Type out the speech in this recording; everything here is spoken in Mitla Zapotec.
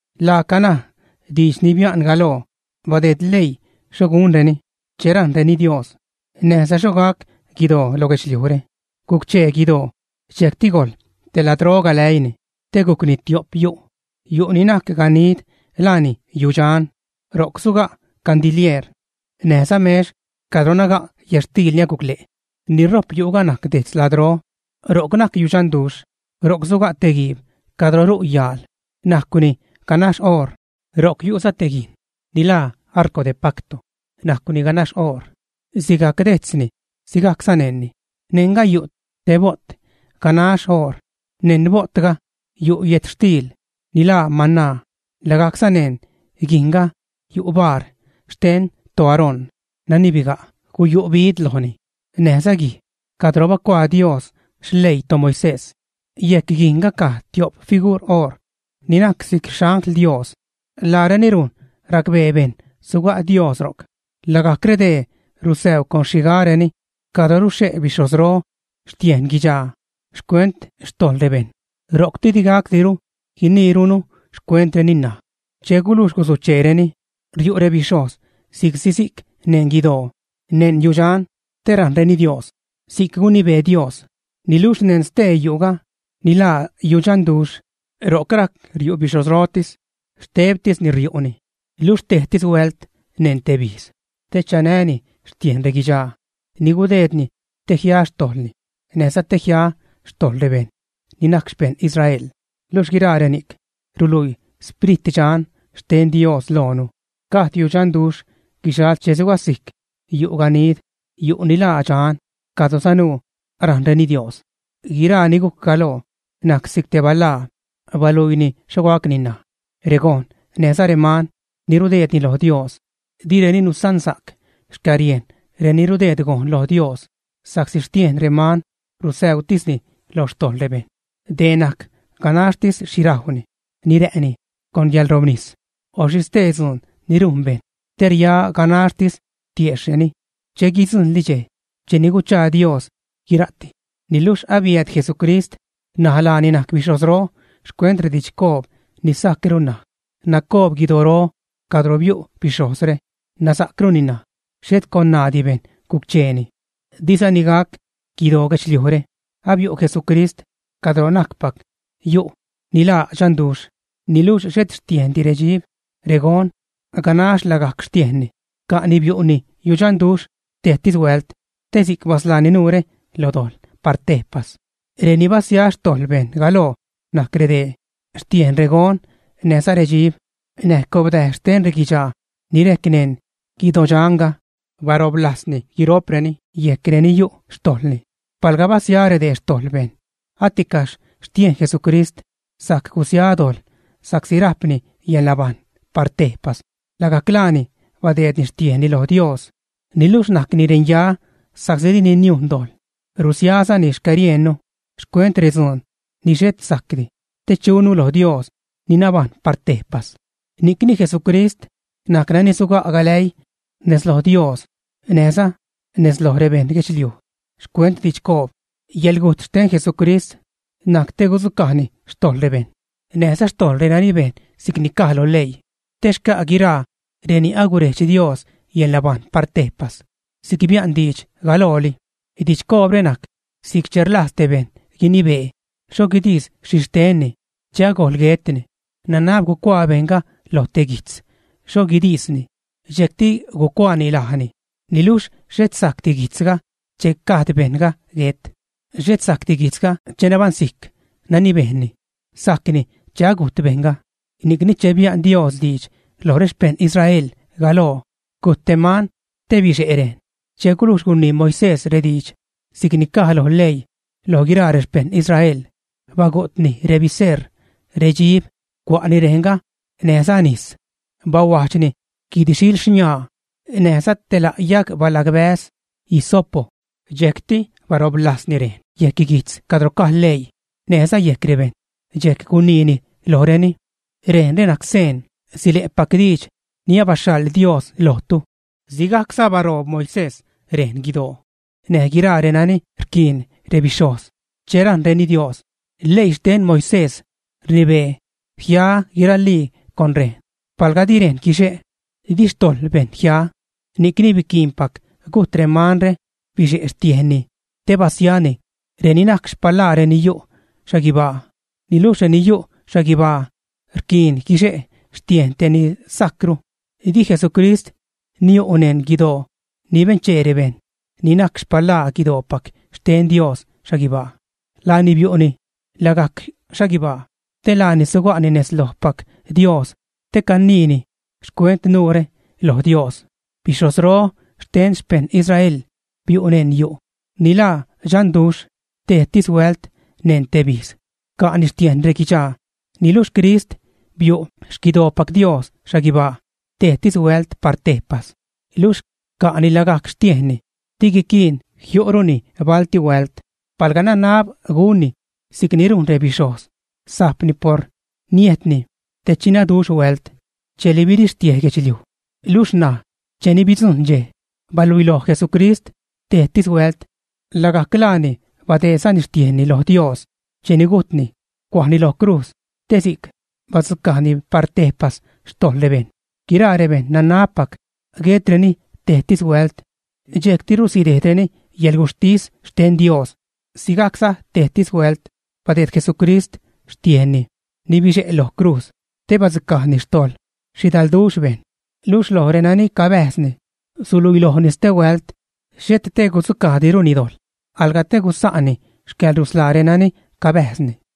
Laaca ṉaj. Diidx ni bia'n galoo badeed leii xho gunreni che rajṉreni Dios, näjza xho gac guidoo lo guidxliujre. Guc-chee guidoo dxejcti gojḻ te ladro galäiini te gujcni tio'p yu'. Yu' ni najc ganid laani yudxan. Ro'c suga' candilieer, näjza mex cadro naga' yätxtiil ni aguc le' Ni rojp yu'ga najc dejtz ladro, ro'c najc yudxanduxh. Ro'c suga' te guiib cadro ru' yaal. Najcni ganax oor. Ro'c yu'za te guijn ni laa “arco de pacto”, najcwni ganax oor, sigajc dejtzni, sigajcza neṉni. Neṉga yu' te bo't ganax oor. Neṉ bo'tga, yu' yätxtiil ni laa mana. Lagajcza neṉ guijnga yu' bar xten toAarón nani biga', guyu' bid lojni, näjza guij cadro bacuaa Dios xleii toMoisés. Yejc guijnga caj tio'p figur oor ni najc si'c xangl Dios. Laareni rujn racbee bejṉ suga' Dios ro'c. Lagajc redee rusäuu con rexhigareni cadro ruxhe' bixhojzro xtiejn guidxaa xcuent xtojḻ rebejṉ. Ro'cti di gacdiru guiniirunu xcuentreni ṉaj. Che gulujx gusucheereni, riu' rebixhojz si'csi si'c neṉ guidoo, neṉ yudxan te rajṉreni Dios si'c gunibee Dios. Niluxh neṉ stee yu'ga ni laa yudxanduxh, ro'c rajc riu' bixhojzrotis. Xtebtisni riu'ni, luxh tejtis huält neṉ teb ijz, te chanäni xtiejn reguidxaa ni gudeedni te jia xtojḻni näjza te jia xtojḻ rebejṉ ni najc xpejṉ Israel. Luxh guiraa reni'c ruluii Sprit Dxan xten Dios loonu, gajd yudxanduxh guxal che sugasijc yu' ganid, yu' ni laa dxan, cadro sanuu rajṉreni Dios. Guiraa ni gujc galoo najc si'c te balaa, baluiini xho gacni ṉaj. Regon näjza reman ni rudeedreni lo Dios direni nusansa'c xcäriejn reni rudeed gojn lo Dios, sa'csi xtiejn reman rusäutisni lo xtojḻ rebejṉ. Dee najc ganaxtis xhi rajwni, ni rä'ni, con yäḻrobnis, o xhi stee dzuun ni rujn bejṉ te ria ganaxtis tiejxhreni che guidzujṉli dxej cheni guchaa Dios guira'ti. Niluxh abiääd Jesucrist, ṉaj laani najc bixhojzro xcuent redidxcoob ni sajcru ṉaj. Nacoob guidoro cadro biu' bixhojzre, nasa'cruni ṉaj. Xhet con ṉaadi bejṉ guc-cheeni. Dizani gac guidoo guedxliujre. Abiu' Jesucrist cadro najcpac yu' ni laa dxanduxh, niluxh xhet xtiejndi redxib, regon; ganax lagajc xtiejnni ca'ni biu'ni yudxanduxh tejtis huält, te si'c basḻaani nuure lo dojḻ par tejpas. Reni basia xtojḻ bejṉ galoo najc redee: xtiejn regon näjza redxib, näj cobdäj xten reguidxaa ni rejc neṉ guidodxanga; bastiojbni guiro'preni yejc reni yu' xtojḻni. Paḻga basia redee xtojḻ bejṉ, aticaxh xtiejn Jesucrist sajc gusia dojḻ, sa'csi rajpni yäḻnabajṉ par tejpas. Lagajc laani badeedni xtiejnni lo Dios. Niluxh najcni renya sa'csi dini niujn dojḻ, rusiazani xcäriejnnu xcuent retzuun ni xhet sajcdi, te chunu loj Dios ni nabajṉ par tejpas. Ni'cni Jesucrist najc nani suga' galäii: nez lo Dios näjza nez loj rebeṉ guedxliuj xcuent didxcoob. Yäḻgujt xten Jesucrist najc te gudzucajni xtojḻ rebeṉ näjza xtojḻ renani bejn si'cni caj lo leii, te xca' guiraa reni agurejdx Dios yäḻnabajṉ par tejpas, si'c bia'n diidx galooli. Didxcoobre najc si'c che rlajz tej bejṉ guinibee xho guidis xhixtenni che agojl guetni, nanab gucuaa bejṉga lo te guijtz xho guidisni, dxejcti gucuaani lajni. Niluxh xhet sajcdi guijtzga che gajd bejṉga guet. Xhet sajcdi guijtzga che nabaṉsijc nani bejnni. Sajcni che agujt bejṉga. Ni'cni che bia'n Dios diidx loj rexpejṉ Israel galoo, gujt te man te bixe' rejn. Che gulujx gunii Moisés rediidx si'c ni caj lo leii loj guiraa rexpejṉ Israel, bagu'tni rebiseṟ, redxib, cua'ni rejnga näjza nis, bahuajdxni guid-xiil xniaa näjza te la' yajg balagbäz, hysopo, dxejcti bastiojbni rejn yejc guijtz cadro caj leii, näjza yejc rebejṉ. Dxejc guniini lojreni: “Rejnre najc seen sile'pac diidx ni abaxhaḻ Dios lojtu.” Sigajcza bastiojb Moisés rejn guidoo näj guiraa renani rquiin rebixhojz che rajṉreni Dios. Leii xten Moisés rnibee jia guiralii con rejn, palga di rejn guixe', di xtojḻ bejṉ jia. Ni'cni biquiinpac gujt remanre, bixe' xtiejnni te basiani reni najc xpalaa reni yu' xhaguibaa, niluxh reni yu' xhaguibaa rquiin guixe' xtiejn te ni sajcru. Di Jesucrist niu' neṉ guidoo ni benchee rebejṉ, ni najc xpalaa guidoopac xten Dios xhaguibaa. Laani biu'ni lagajc xhaguibaa, te laani suga'ni nez lojpac Dios te caniini xcuent nuure loj Dios. Bixhojzro xten xpeṉ Israel biu' neṉ yu' ni laa dxanduxh tejtis huält neṉ teb ijz, ca'ni xtiejn reguidxaa. Niluxh Crist biu' xquidoopac Dios xhaguibaa tejtis huält par tejpas, luxh ca'ni lagajc xtiejnni. Di guiquiin jiu'runi balti huält. Palga nanab gunni si'cni rujn rebixhojz, sajpni por niejtni te chinaduxh huält cheli birixtiej guedxliuj. Luxh ṉaj, cheni bidzujṉ dxej, baluiloj Jesucrist tejtis huält, lagajc laani badeedzani xtiejnni lo Dios cheni gujtni, cuajni lo crujz te si'c badzucajni par tejpas xtojḻ rebejṉ. Guiraa bejṉ nanabpac guetreni tejtis huält, dxejctiru sidejdreni yäḻguxhtis xten Dios. Sigajcza tejtis huält badeed Jesucrist xtiejnni ni bixe' lo crujz te badzucajni xtojḻ xhidalduxh bejṉ. Luxh loj renani cabäjzni suluiilojni stehuält, xhet te gudzucajdiruni dojḻ, alga te gusa'ni xcäḻrusḻaa renani cabäjzni.